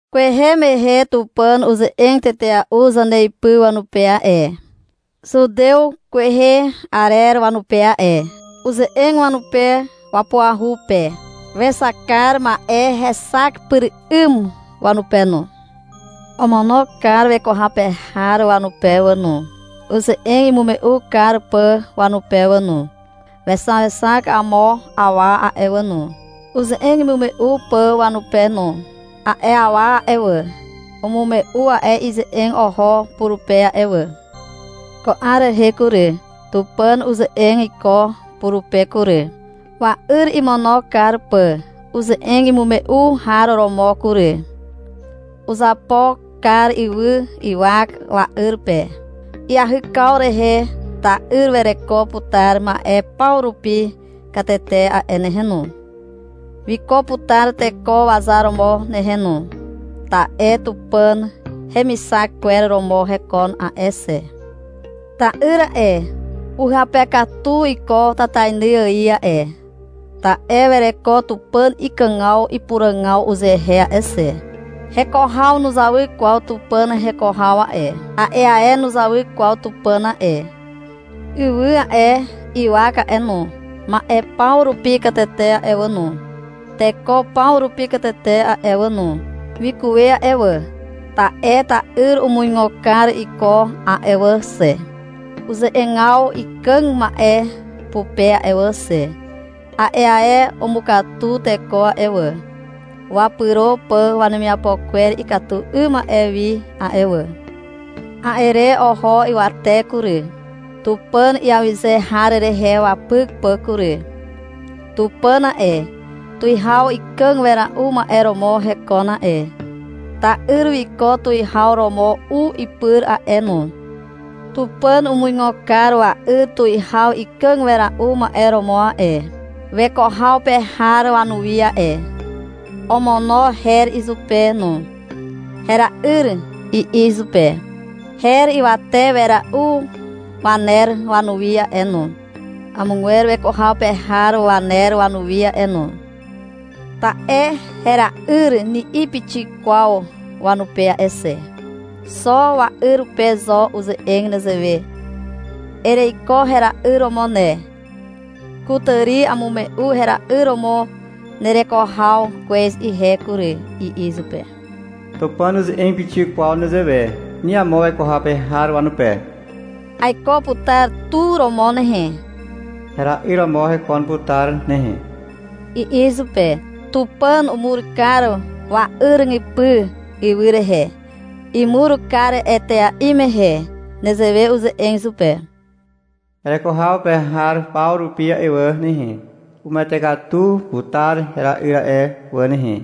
Kwehe mehe Tupàn uze'eg tetea'u zaneipy wanupe a'e, zutew kwehe arer wanupe a'e. Uze'eg wanupe wapuahu pe. Wexak kar ma'e hexak pyr 'ym wanupe no. Omono kar weko haw pe har wanupe wà no, uze'eg imume'u kar pà wanupe wà no. Wexaexak amo awa a'e wà no, uze'eg imume'u pà wanupe no. A'e awa a'e wà, umume'u a'e ize'eg oho purupe a'e wà. Ko 'ar rehe kury, Tupàn uze'eg iko purupe kury, wa'yr imono kar pà uze'eg imume'u har romo kury. Uzapo kar ywy ywak wa'yr pe. Iahykaw rehe ta'yr wereko putar ma'e paw rupi katete a'e nehe no. Wiko putar teko wazar romo nehe no, ta'e Tupàn hemixak kwer romo hekon a'e xe. Ta'yr a'e, uhyape katu iko tatainy ài a'e, ta'e wereko Tupàn ikàgaw ipuràgaw uzehe a'e xe. Heko haw nuzawy kwaw Tupàn heko haw a'e. A'e ae nuzawy kwaw Tupàn a'e. Ywy a'e, ywak a'e no, ma'e paw rupi katete a'e wà no, teko paw rupi katete a'e wà no, wikuwe a'e wà, ta'e ta'yr umuigo kar iko a'e wà xe, uze'egaw ikàg ma'e pupe a'e wà xe. A'e ae umukatu teko a'e wà, wapyro pà wanemiapo kwer ikatu 'ym ma'e wi a'e wà. A'e re oho ywate kury, Tupàn iawyze har rehe wapyk pà kury. Tupàn a'e, tuwihaw ikàg wera'u ma'e romo hekon a'e. Ta'yr wiko tuwihaw romo u ipyr a'e no. Tupàn umuigo kar wa'yr tuwihaw ikàg wera'u ma'e romo a'e, weko haw pe har wanuwi a'e. Omono her izupe no. — Hera'yr, i'i izupe. Her ywate wera'u waner wanuwi a'e no, amogwer weko haw pe har waner wanuwi a'e no. Ta'e — Hera'yr, ni'i pixik kwaw wanupe a'e xe. Xo wa'yr pe zo uze'eg nezewe. — Ereiko hera'yr romo ne. Kutàri amume'u hera'yr romo nereko haw kwez ihe kury, i'i izupe. Tupàn nuze'eg pixik kwaw nezewe ni amo weko haw pe har wanupe. — Aiko putar tu romo nehe. Hera'yr romo hekon putar nehe, i'i izupe. Tupàn umur kar wa'yripy ywy rehe. Imur kar etea'i mehe nezewe uze'eg izupe. — Hereko haw pe har paw rupi a'e wà nehe, umuwete katu putar hera'yr a'e wà nehe,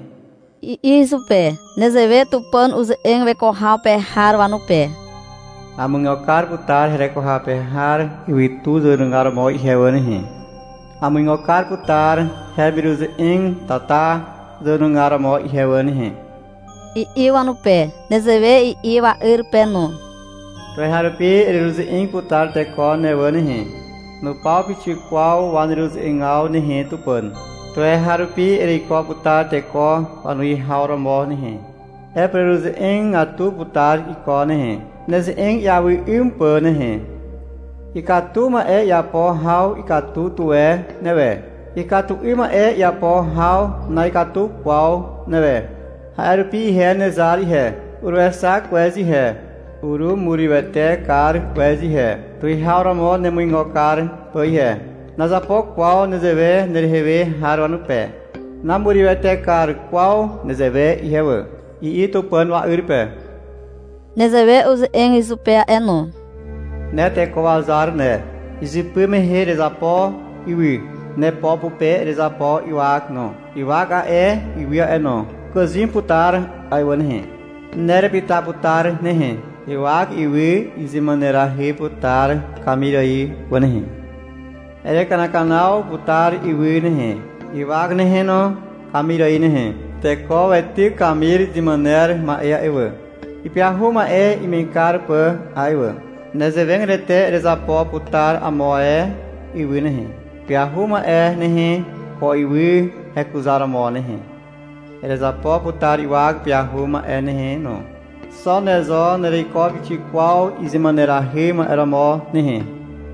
i'i izupe. Nezewe Tupàn uze'eg weko haw pe har wanupe. — Amuigo kar putar hereko haw pe har ywytu zàwenugar romo ihe wà nehe. Amuigo kar putar heremiruze'eg tata zàwenugar romo ihe wà nehe, i'i wanupe. Nezewe i'i wa'yr pe no. — Tuweharupi ereruze'eg putar teko ne wà nehe. Nupaw pixik kwaw waneruze'egaw nehe, Tupàn. Tuweharupi ereiko putar teko wanuwihaw romo nehe. Erepureruze'egatu putar iko nehe, neze'eg iawy 'ym pà nehe. Ikatu ma'e iapo haw ikatu tuwe newe. Ikatu 'ym ma'e iapo haw na'ikatu kwaw newe. A'e rupi ihe nezar ihe, uruexak kwez ihe. Urumurywete kar kwez ihe, tuwihaw romo nemuigo kar pà ihe. Nazapo kwaw nezewe nerehe we har wanupe. Namurywete kar kwaw nezewe ihe wà, i'i Tupàn wa'yr pe. Nezewe uze'eg izupe a'e no. — Ne teko wazar ne. Izypy mehe erezapo ywy. Nepo pupe erezapo ywak no. Ywak a'e, ywy a'e no, ukàzym putar a'e wà nehe. Ne erepyta putar nehe. Ywak ywy izymànerahy putar kamir ài wà nehe. Erekanakanaw putar ywy nehe, ywak nehe no, kamir ài nehe. Teko weityk kamir izemàner ma'e a'e wà, ipyahu ma'e ime'eg kar pà a'e wà. Nezewegatete erezapo putar amo ae ywy nehe, ipyahu ma'e nehe, ko ywy hekuzaromo nehe. Erezapo putar ywak ipyahu ma'e nehe no. Xo ne zo nereiko pixik kwaw izemànahy ma'e romo nehe.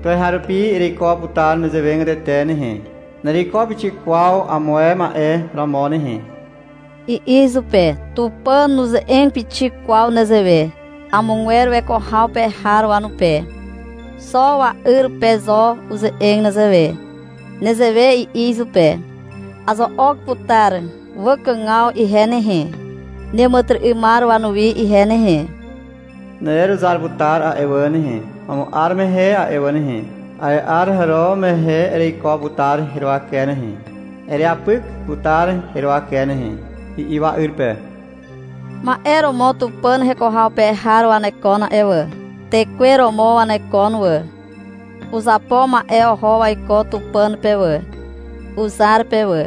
Tuweharupi ereiko putar nezewegatete nehe. Nereiko pixik kwaw amo ae ma'e romo nehe, i'i izupe. Tupàn nuze'eg pixik kwaw nezewe, amogwer weko haw pe har wanupe. Xo wa'yr pe zo uze'eg nezewe. Nezewe i'i izupe. — Azo'ok putar wakàgaw ihe nehe, neàmàtyry'ymar wanuwi ihe nehe. Nereruzar putar a'e wà nehe, Amo 'ar mehe a'e wà nehe. A'e 'ar hàro mehe, ereiko putar heruwake nehe. Ereapyk putar heruwake nehe, i'i wa'yr pe. Ma'e romo Tupàn heko haw pe har wanekon a'e wà. Tekwe romo wanekon wà. Uzapo ma'e oho waiko Tupàn pe wà, uzar pe wà.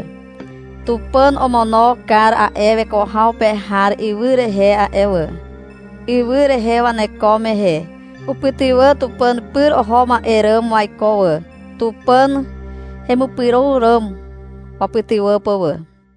Tupàn omono kar a'e weko haw pe har ywy rehe a'e wà. Ywy rehe waneko mehe upytywà Tupàn pyr oho ma'e ràm waiko wà, Tupàn hemipyro ràm wapytywà pà wà.